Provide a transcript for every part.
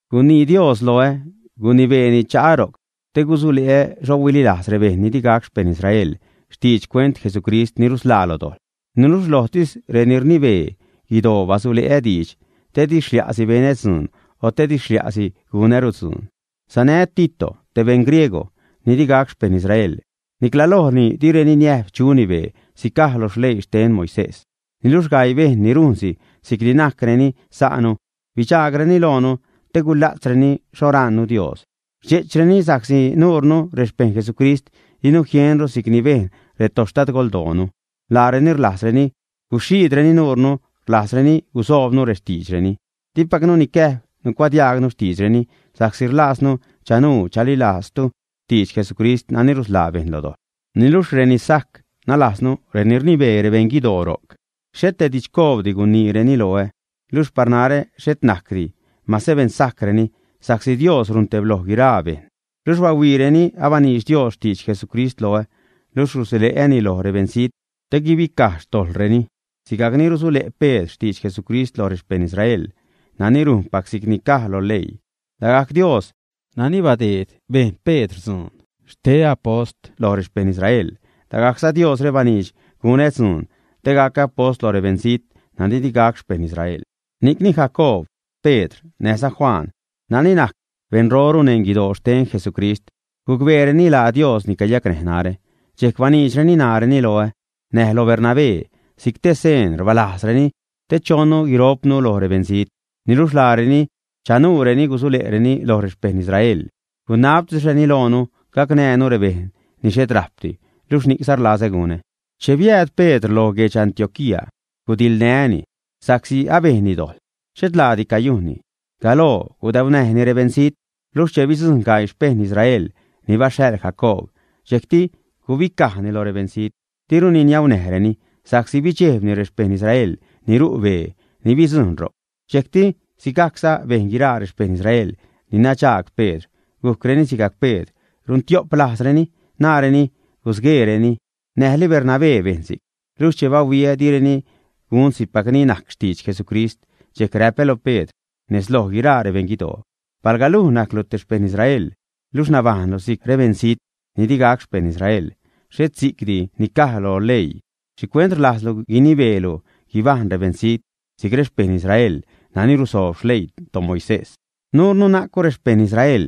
Gunii Dios loä, gunibeeni cha'a ro'c te gusule'ä xho huililajz rebejṉ ni di gac xpejṉ Israel xtidx xcuent Jesucrist ni rusḻaa lo dojḻ. Niluxh lojtis reni rnibee guidoo basule'ä diidx, te di xlia'si benä dzuun, o te di xlia'si gunäru dzuun. Sanää́ Tito, te beṉ griegw ni di gac xpejṉ Israel. Nicla lojni direni niäjb chuni bee si'c caj lo leii xten Moisés. Niluxh gaii bejṉ ni rujnsi si'cni najcreni sa'nu, bidxaagreni loonu te gula'tzreni xho rajṉnu Dios. Rdxe'chreni sa'csi nuunu, rexpejṉ Jesucrist, dinu jienru si'c ni bejn retoxtadgoldoonu. Laareni rlajzreni guxhiidreni nurnu, rlajzreni gusoobnu rextiidxreni. Dipacnu nicäjb nucuadiajgnu xtiidxreni, sa'csi rlaaznu chanuu chalilajztu xtidx Jesucrist nani rusḻaa bejṉ lo dojḻ. Niluxh reni sajc, nalajznu reni rnibee rebeṉ guidoo ro'c, xhet te didxcoobdi guniireni loä. (Luxh par narä xhet najcdi mase beṉsajcreni, sa'csi Dios runtebloj guiraa bejṉ.) Luxh bahuiireni abaniidx Dios xtidx Jesucrist loä, luxh rusule'äni loj rebeṉzijt te guibicaj xtojḻreni, sigajcni rusule' Pedr xtidx Jesucrist loj rexpeṉ Israel nani rujnpac si'c ni caj lo leii. Lagajc Dios nani badeed bejn Pedr dzuun xte apost loj rexpeṉ Israel, lagajcza Diosre baniidx gunä dzuun, te gacä apost loj rebeṉzijt nani di gac xpejṉ Israel. Ni'cni Jacoob, Pedr, näjza Juan nani najc beṉroru neṉ guidoo xten Jesucrist, gucbeereni laa Dios ni cayacnäj narä. Dxejc baniidxreni ṉaareni loä näj lo Bernabé si'c te seen rbalajzreni, te chonnu guiro'pnu loj rebeṉzijt. Niluxh laareni chanuureni gusule'reni loj rexpeṉ Israel. Gunabtisreni loonu gacnäjnu rebejṉ ni xhet rajpdi, luxh ni'cza rlazä gunä. Che biääd Pedr lo guedx Antioquía, gudiḻnää́ni, sa'csi abejnni dojḻ xhet laadi cayujnni. Galoo gudaunäjni rebeṉzijt, luxh che bidzujṉ gaii xpejṉ Israel ni baxhaḻ Jacoob, dxejcti gubicajni lo rebeṉzijt, diruni niaunäjreni sa'csi bidxejbni rexpejṉ Israel ni ru' bee ni bidzujṉ ro'c. Dxejcti sigajcza bejn guiraa rexpejṉ Israel ni nadxaag Pedr, gujcreni sigajc Pedr, runtio'p lajzreni, naareni gusgueereni. Näjli Bernabé bejn si'c. Luxh che bahuiä direni gun si'cpacni najc xtidx Jesucrist, dxejc räpä loj Pedr nez loj guiraa rebeṉ guidoo: “Palga luj najclu te xpejṉ Israel, luxh nabajṉlu si'c rebeṉzijt ni digac xpejṉ Israel, xhet si'cdi ni caj loj leii, ¿xhicuent rlajzlu guinibeelu guibajṉ rebeṉzijt si'c rexpejṉ Israel nani rusoob xleii toMoisés?” Nuure najcnu rexpejṉ Israel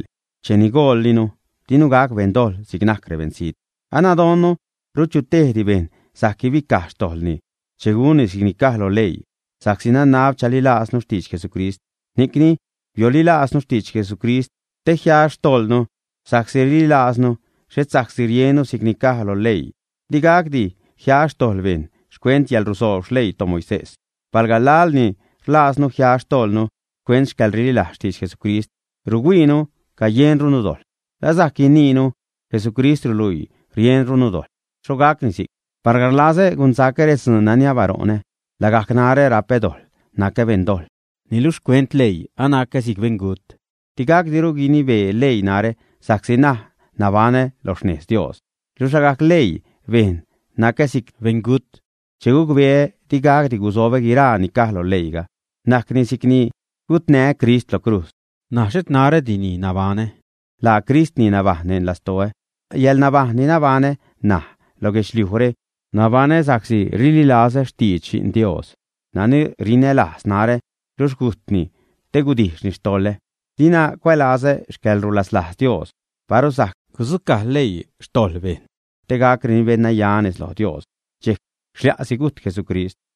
cheni gojllinu; dinu gac beṉdojḻ si'c najc rebeṉzijt. Anadonnu rut chu tejti bejṉ sajc guibicaj xtojḻni che gunni si'cni caj lo leii, sa'csi nanab chalilajznu xtidx Jesucrist. Ni'cni biolilaaznu xtidx Jesucrist te jia xtojḻnu sa'csi rililajznu, xhet sa'csi riennu si'cni caj loj leii. Di gacdi jia xtojḻ bejṉ xcuent yäḻrusoob xleii toMoisés. Palga laḻ ni rlajznu jia xtojḻnu xcuent xcäḻrililajz xtidx Jesucrist, ruhuiinu cayenrunu dojḻ, la sajc guiniinu: Jesucrist ruluii rienrunu dojḻ, ¿ä? ¡Xho gacni si'c! Palga rlazä gunsacä redzuun nani abaṟo'nä, lagajc narä rapä dojḻ nacä beṉ dojḻ. Niluxh xcuent leii, anacä si'c beṉgut: digacdiru guinibee leii narä sa'csi ṉaj nabaṉä lo xnejz Dios. Luxh lagajc leii bejn nacä si'c beṉgut che gucbeä di gacdi gusobä guiraa ni caj lo leiiga. Najcni si'cni gutnää́ Crist lo crujz. N̲aj xhet narädi ni nabaṉä, laa Crist ni nabajṉ neṉ lastoä. Yäḻnabajṉ ni nabaṉä ṉaj lo guedxliujre nabaṉä sa'csi rlilazä xtidx Xi'n Dios nani rinälajz narä luxh gujtni te gudijxni xtoḻä. Dina cuälazä xcäḻrulaslajz Dios. Paru sajc gudzucaj leii xtojḻ bejṉ te gacreni beṉnaya nez loj Dios, dxejc xlia'si gujt Jesucrist.